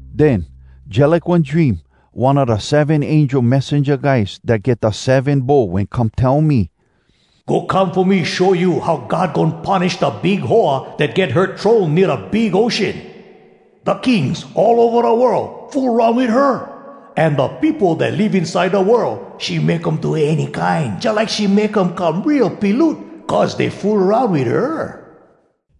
Den, jalike one dream, one a da seven angel messenja guys dat get da seven bowl wen come tell me, “Go come fo me show you how God goin punish da big hoa dat get her throne nea da big ocean. Da kings all ova da world fool aroun wit her. An da peopo dat live inside da world, she make um do any kine, jalike she make um come real piloot, cuz dey fool aroun wit her.”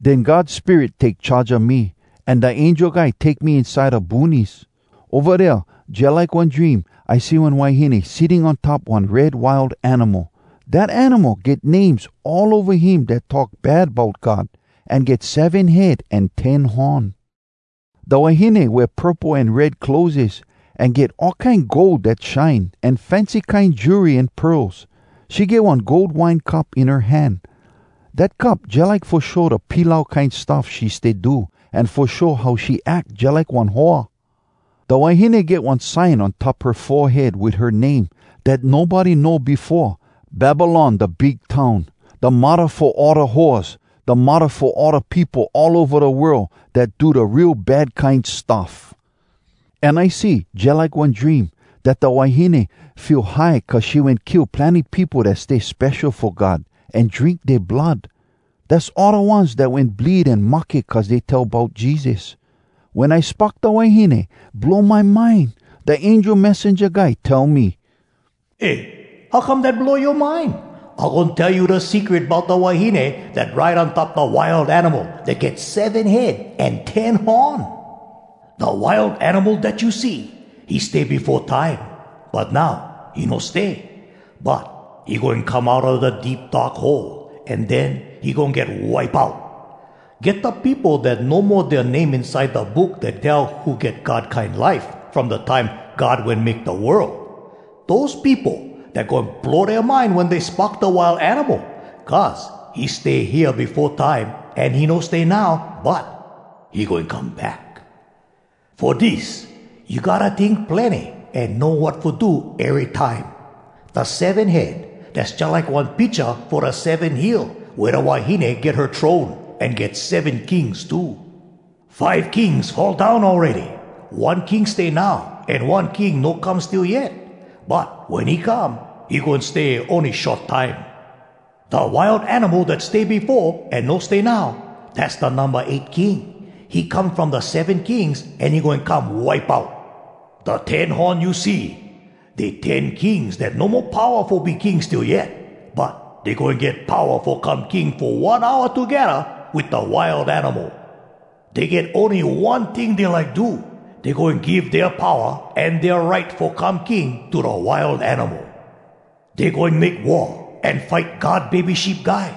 Den God Spirit take charge a me, an da angel guy take me inside da boonies. Ova dea, jalike one dream, I see one wahine sitting on top one red wild animal. Dat animal get names all ova him dat talk bad bout God, an get seven head an ten horn. Da wahine wea purple an red clotheses, an get all kine gold dat shine, an fancy kine jewelry an pearls. She get one gold wine cup in her hand. Dat cup jalike fo show da pilau kine stuff she stay do, an fo show how she ack jalike one hoa. Da wahine get one sign on top her forehead wit her name, dat nobody know befo: “Babylon, Da Big Town: Da Muddah Fo All Da Hoaz, Da Muddah Fo All Da Peopo All Ova Da World Dat Do Da Real Bad Kine Stuff.” An I see, jalike one dream, dat da wahine feel high cuz she wen kill plenny peopo dat stay spesho fo God, an drink dea blood. Dass all da ones dat wen bleed an mahke cuz dey tell bout Jesus. Wen I spock da wahine, blow my mind. Da angel messenja guy tell me, “Eh, how come dat blow yoa mind? I goin tell you da secret bout da wahine dat ride on top da Wild Animal dat get seven head an ten horn. “Da Wild Animal dat you see, he stay befo time, but now he no stay. But he goin come outa da Deep Dark Hole, an den he goin get wipe out. Get da peopo dat no mo dea name inside da Book Dat Tell Who Get God Kine Life, from da time God wen make da world. Dose peopo, dat goin blow dea mind wen dey spock da Wild Animal. Cuz he stay hea befo time, an he no stay now, but he goin come back. “Fo dis, you gotta tink plenny an know wat fo do ery time. Da seven head, dass jalike one picha fo da seven hill wea da wahine get her throne, an get seven kings too. Five kings fall down awready, one king stay now, an one king no come still yet. But wen he come, he goin stay ony short time. Da Wild Animal dat stay befo, an no stay now, dass da numba eight king. He come from da seven kings, an he goin come wipe out. “Da ten horn you see, dey ten kings dat no mo powa fo be king still yet. But dey goin get powa fo come king fo one hour togedda wit da Wild Animal. Dey get ony one ting dey like do: dey goin give dea powa an dea right fo come king to da Wild Animal. Dey goin make war an fight God Bebe Sheep Guy.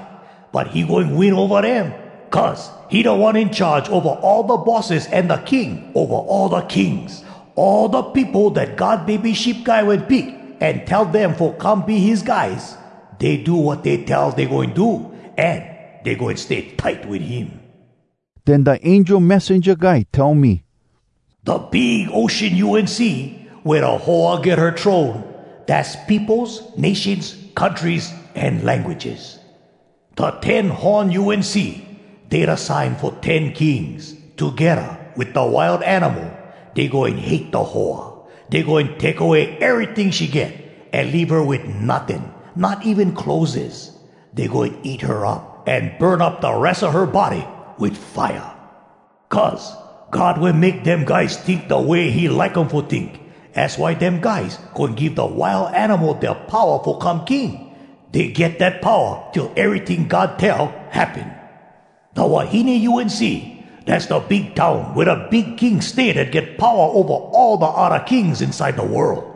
But he goin win ova dem, cuz he Da One In Charge Ova All Da Bosses an da King ova all da kings! All da peopo dat God Bebe Sheep Guy wen pick an tell dem fo come be his guys, dey do wat dey tell dey goin do, an dey goin stay tight wit him.” Den da angel messenja guy tell me, “Da big ocean you wen see, wea da hoa get her throne, dass peopos, nations, countries, an languages. Da ten horn you wen see, dey da sign fo ten kings. Togedda wit da Wild Animal, dey goin hate da hoa. Dey goin take away eryting she get, an leave her wit notting, not even clotheses. Dey goin eat her up an burn up da res a her body wit fire. Cuz God wen make dem guys tink da way he like um fo tink. Az why dem guys goin give da Wild Animal dea powa fo come king. Dey get dat powa till eryting God tell happen. Da wahine you wen see, dass da big town wea da big king stay dat get powa ova all da odda kings inside da world.”